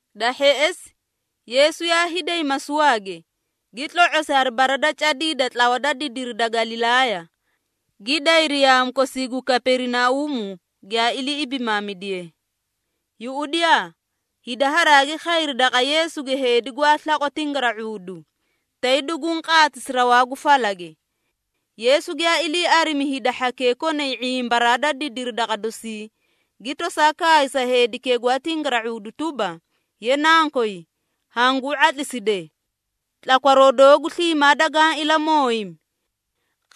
Da hheꞌesi, Yeesu yaa hiiday masuwaage, gi tlo⁄osi hari bara da cadii da tlawa da didiri da Galilaaya, gi dayri yaamu kosii gu Kaperinauumu giyaa ilii ibimaamidiye. Yuꞌudiyaa! Hida haraagi khayri daqa Yeesuge heedi gwaa slaqwa tingara⁄uudu, tay duguũ qaatisi rawaa gu falage. Yeesu giyaa ilii arimi hida hhakee konay ⁄imbaraa da didiru daqa dosii, gi tosaa kaay sa heedikee gwaa tingara⁄uudu tuba, “Ye nankoy, hanguu ⁄atliside! Tlakwaroo doogu sliimaa dagaã ilamooyimi!”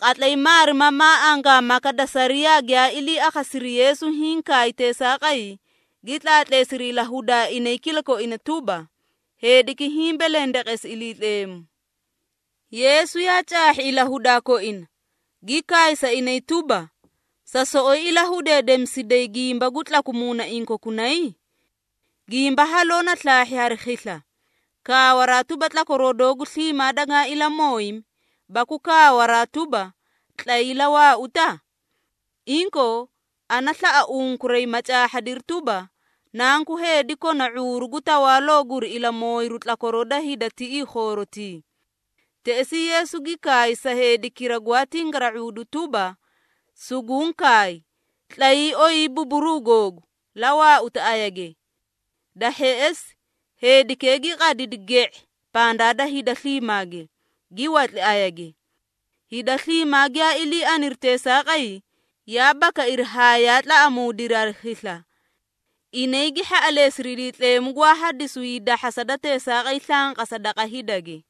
Qatlay maarimamaa angaamaka da sariyaa giyaa ilii akhasiri Yeesu hiĩ kaay teesaaqay, gi tlaatleesiri ilahudaa inay kilakoina tuba, “Heediki hiĩ belendeqesi Iliitleemu.” Yeesu yaa caahhi ilahudaa koina, gi kaay sa inay tuba, “Sa soꞌoyi ilahudeedemisiday gimba gu tlaku muunaiĩ kokunay? Gimba haloo na slaahhi hari khisla, kaawaraa tuba, ‘Tlakwaroo doogu sliimaa dagaa ilamooyimi,’ baku kaawaraa tuba, ‘Tlayii, la waauta?’ Inkoo, ana slaꞌa unkuray, ma caahhadiri tuba, Nanku Heedi kona ⁄uuru gu tawaaloo guri ilamooyiru tlakwaroo da hida tiꞌii khoorotii!” Teꞌesii Yeesu gi kaay sa heedikira gwaa tingara⁄uudu tuba, “Suguũ kaay, tlayii, oyii buburuu googu, la waauta ayage!” Da hheꞌesi, heedikee gi qadidi ge⁄e pandaa da hida sliimaage, gi watli ayage. Hida sliimaa giyaa ilii aniri teesaaqay, yaa bakairi haa yaa tlaꞌamuudiri hari khisla! Inay gi hhaꞌaleesiri Iliitleemu gwaa hadisu hiidahhasa da teesaaqay slanqasa daqa hidage.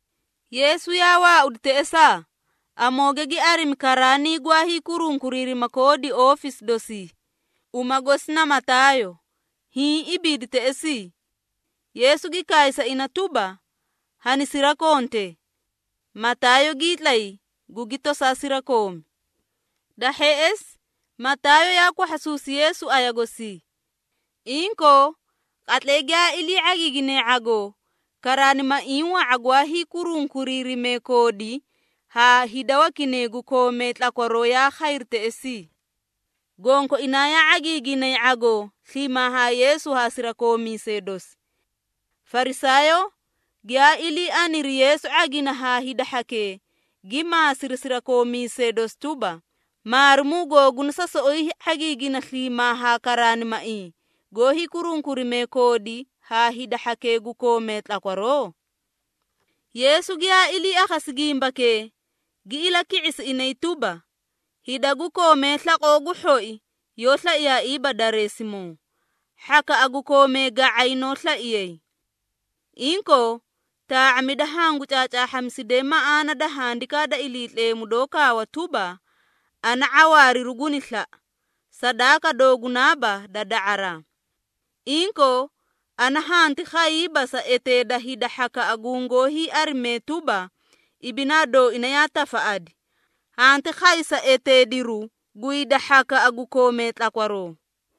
Yeesu yaa waaudi teꞌesaa, amooge gi arimi karaanii gwaa hiikurunkuriirima koodi oofisi dosii, uma gosi na Mataayo, hiĩ ibiidi teꞌesii. Yeesu gi kaay sa ina tuba, “Hanisirakonte!” Mataayo gii tlay, gugi tosaa sirakoomi. Da hheꞌesi, Mataayo yaa kwahhasuusi Yeesu aya gosii. Inkoo, qatlay giyaa ilii ⁄agiigine ⁄agoo, karaanimaiĩ wa⁄a gwaa hiikurunkuriirimee koodi haa hida wakinay gu koomee tlakwaroo yaa khayri teꞌesii. Gonkoinaa yaa ⁄agiiginay ⁄agoo sliimaa haa Yeesu haa sirakoomiisee dosi. Farisaayoo giyaa ilii aniri Yeesu ⁄agina haa hida hhakee, gi maasiri sirakoomiisee dosi tuba, “Maarimuu googuna sa soꞌoyi ⁄agiiginay sliimaa haa karaanimaiĩ goó hiikurunkurimee koodi haa hida hhakee gu koomee tlakwaroo?” Yeesu giyaa ilii akhasi gimbakee, gi ilaki⁄isi inay tuba, “Hida gu koomee slaqoo gu hhoi yoó slaiyaaiiba dareesimoo, hhakaꞌa gu koomee ga⁄ay noó slaiyay. Inkoo, taa⁄amida hangu caacaahhamisidee maꞌaana da Handikaa da Iliitleemu doó kaawa tuba, ‘Ana ⁄awaariru guni slaꞌa, sadaaka doogunaaba da da⁄araa.’ Inkoo, ana hanti khayiiba sa eteeda hida hhakaꞌa gungoó hiiarimee tuba, ibinaa dooina yaa tafaꞌadi, hanti khay sa eteediru gu hida hhakaꞌa gu koomee tlakwaroo.”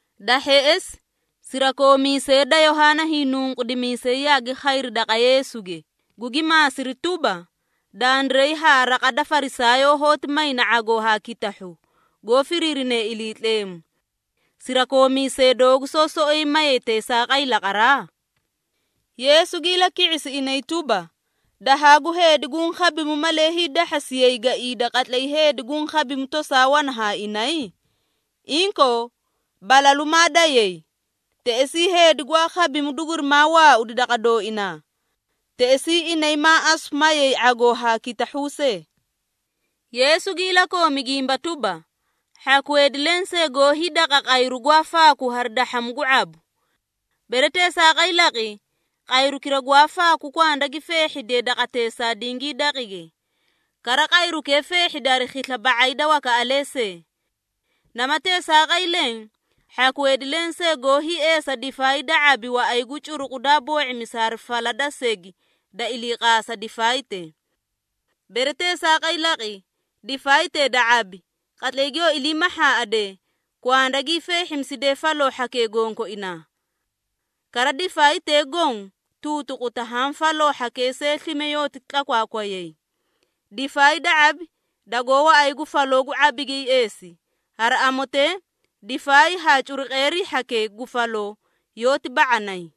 Da hheꞌesi, sirakoomiisee da Yohaana Hiinunqudimiisay yaagi khayri daqa Yeesuge, gugi maasiri tuba, “Dandiray haa raqa da Farisaayoo hoóti mayna ⁄agoo haa kitahhu, goó firiirine Iliitleemu. Sirakoomiisee doogu soó soꞌoyi mayay teesaaqay laqaraa?” Yeesu gi ilaki⁄isi inay tuba, “Dahaa gu heedi guũ khabimu, malee hiidahhasiyay gaiida qatlay heedi guũ khabimu tosaa wana haa inay? Inkoo, balalu maa dayay, teꞌesii heedi gwaa khabimu dugurimaa waaudi daqa dooinaa. Teꞌesii inay maa asu mayay ⁄agoo haa kitahhu see.” Yeesu gi ilakoomi gimba tuba, “Hhaku heedi lensee goó hiidaqa qayru gwaa faaku hari dahhamu gu ⁄abu. Bere teesaaqay laqi, qayrukira gwaa faaku kwanda gi feehhidiye daqateesaa dingii daqige, kara qayrukee feehhidi hari khisla ba⁄ay da wakaꞌalee see. Nama teesaaqay leẽ, hhaku heedi lensee goó hiieesa difaay da ⁄abi waꞌay gu curuqu daa boo⁄imisi hari fala da segi da iliiqaasa difaaytee. Bere teesaaqay laqi, difaaytee da ⁄abi, qatlay giyoo ilii mahhaaꞌade, kwanda gii feehhimiside faloo hhakee gonkoinaa. Kara difaaytee goõ tuutuquta haã faloo hhakee see slime yooti tlakwaakwayay. Difaay da ⁄abi dagoó waꞌay gu faloo gu ⁄abige hiieesi, hari amotee difaay haa curuqeerii hhakee gu faloo, yoóti ba⁄anay.”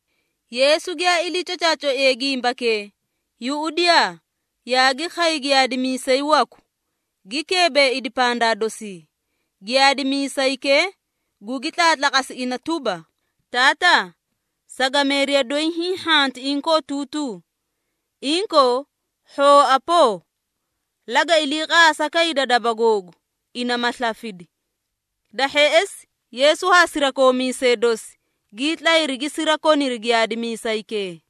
Yeesu giyaa ilii cocaacoiye gimbakee, yuꞌudiyaa, yaagi khay giyaadimiisay waku, gi keebeeidi pandaa dosii. Giyaadimiisaykee gugi tlaatlaqasi ina tuba, “Taataa, sagameeriya doyi hiĩ hhanti inkootuutuu. Inkoo, hhooa poo, laga iliiqaasa kayda daba googu, ina ma slafidi.” Da hheꞌesi, Yeesu haa sirakoomiisee dosi gii tlayri gi sirakoniri giyaadimiisaykee.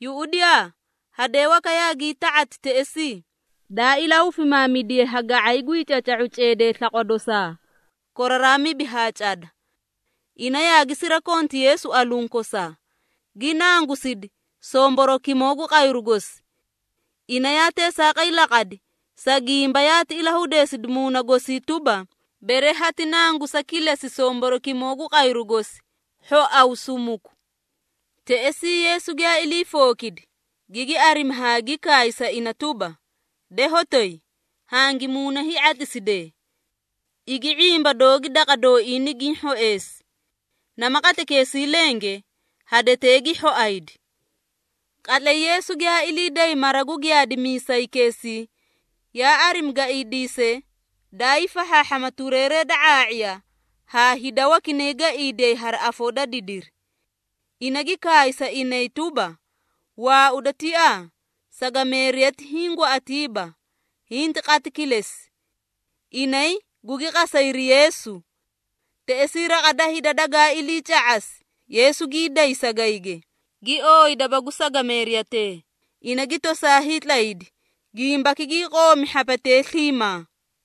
Yuꞌudiyaa! Hadee waka yaagii ta⁄ati teꞌesii, daa ilahufimaamidiye ha ga⁄ay gwii caca⁄uu ceedee slaqwa dosaa koraraa mibi haa cada. Ina yaagi sirakonti Yeesu aluũ kosaa, gi nangusidi somborokimoo gu qayru gosi. Ina yaa teesaaqay laqadi, sa gimba yaati ilahudeesidi muuna gosii tuba, “Bere hati nangusa kilesi somborokimoo gu qayru gosi, hhoaw sumuku.” Teꞌesii Yeesu giyaa ilii fookidi, gigi arimi haa gi kaay sa ina tuba, “De hotoyi, hangi muuna hii⁄atliside! Igi ⁄imba doogi daqa dooii nigiĩ hhoeesi.” Nama qatlaykeesii lenge, hadetee gi hhoaydi. Qatlay Yeesu giyaa ilii day mara gu giyaadimiisaykeesii, yaa arimi gaiidiisee daa hiifahhaahhama tureeree da ⁄aa⁄iya haa hida wakinay gaiidiyay hari afoo da didiri. Ina gi kaay sa inay tuba, “Waauda tiaa! Sagameeriyati hiĩ gwaꞌatiiba, hinti qati kilesi.” Inay gugi qasayri Yeesu. Teꞌesii raqa da hida dagaa iliica⁄asi, Yeesu gii day sagayge, gi ooyi daba gu sagameeriyatee, ina gi tosaa hiitlaydi. Gimbaki gii qoomi hhapetee sliimaa.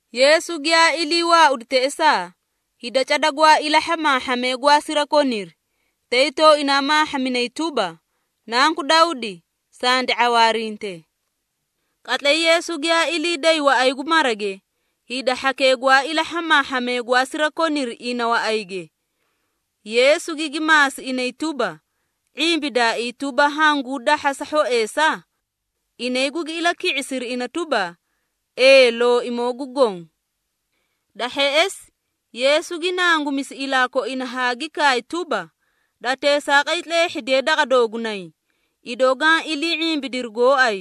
Yeesu giyaa ilii waaudi teꞌesaa, hida cada gwaa ilaa hhamaahhamee gwaa sirakoniri, tay tooinaa maahhaminay tuba, “Nanku Dawdi, sandi ⁄awaarinte!” Qatlay Yeesu giyaa ilii day waꞌay gu marage hida hhakee gwaa ilaa hhamaahhamee gwaa sirakoniri ina waꞌayge. Yeesu gigi maasi inay tuba, “⁄imbidaaii tuba, hanguu dahhasa hhoeesa?” Inay gugi ilaki⁄isiri ina tuba, “Ee Looimoo gu Goõ.” Da hheꞌesi, Yeesu gi nangumisi ilaa koina haa gi kaay tuba, “Da teesaaqay tleehhidiye daqa doogunay, idoo gaã ilii ⁄imbidiri gooay.”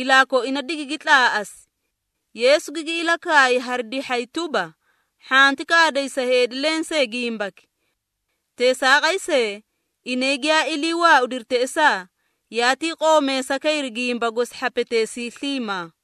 Ilaa koina digigi tlaaꞌasi. Yeesu gigi ilakaay hari dihhay tuba, “Hhanti kaaday sa heedi lensee gimbaki.” Teesaaqay see, inay giyaa ilii waaudiri teꞌesaa, yaatii qoomeesa kayri gimba gosi hhapeteesii sliimaa.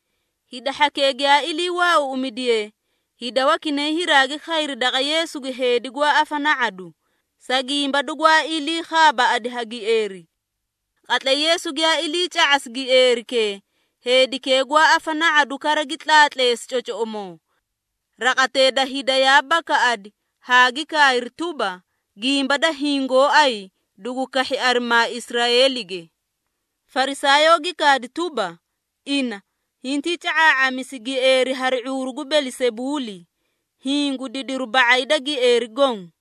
Hida hhakee giyaa ilii waauuꞌumidiyee, hida wakinay hiraagi khayri daqa Yeesuge heedi gwaa afana⁄adu, sa gimba dugwaa ilii khaabaaꞌadi ha gieeri. Qatlay Yeesu giyaa iliica⁄asi gieerikee, heedikee gwaa afana⁄adu kara gi tlaatleesi cocoꞌomoo. Raqatee da hida yaa bakaꞌadi haa gi kaayri tuba, “Gimba da hiĩ gooay dugu kahhi arimaa Israeelige.” Farisaayoo gi kaadi tuba, “Ina, hintii ca⁄aa⁄amisi gieeri hari ⁄uuru gu Belisebuuli, hiĩ gu didiru ba⁄ay da gieeri goõ!”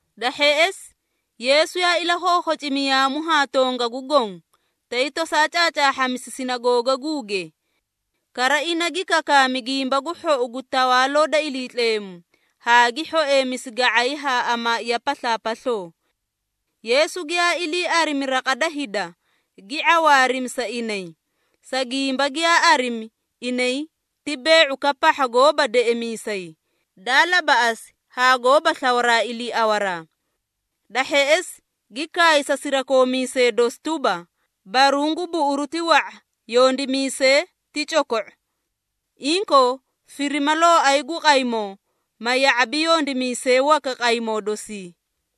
Da hheꞌesi, Yeesu yaa ilakhookhocimi yaamu haa tongagu goõ tay tosaa caacaahhamisi sinagoogaguuge. Kara ina gi kakaami Gimba gu Hhou gu Tawaaloo da Iliitleemu haa gi hhoeemisi ga⁄ay haa amaaiya paslaapasloo. Yeesu giyaa ilii arimi raqa da hida, gi ⁄awaarimi sa inay, sa gimba giyaa arimi inay ti bee⁄ukaꞌa pahha goóba deꞌemiisay, daa labaꞌasi haa goóba slawaraa iliiawaraa. Da hheꞌesi, gi kaay sa sirakoomiisee dosi tuba, “Baruũ gu buꞌuru ti wa⁄a, yondimiisee ti coko⁄o. Inkoo, firima Looay gu qaymoo, ma ya⁄abi yondimiisee waka qaymoo dosii.”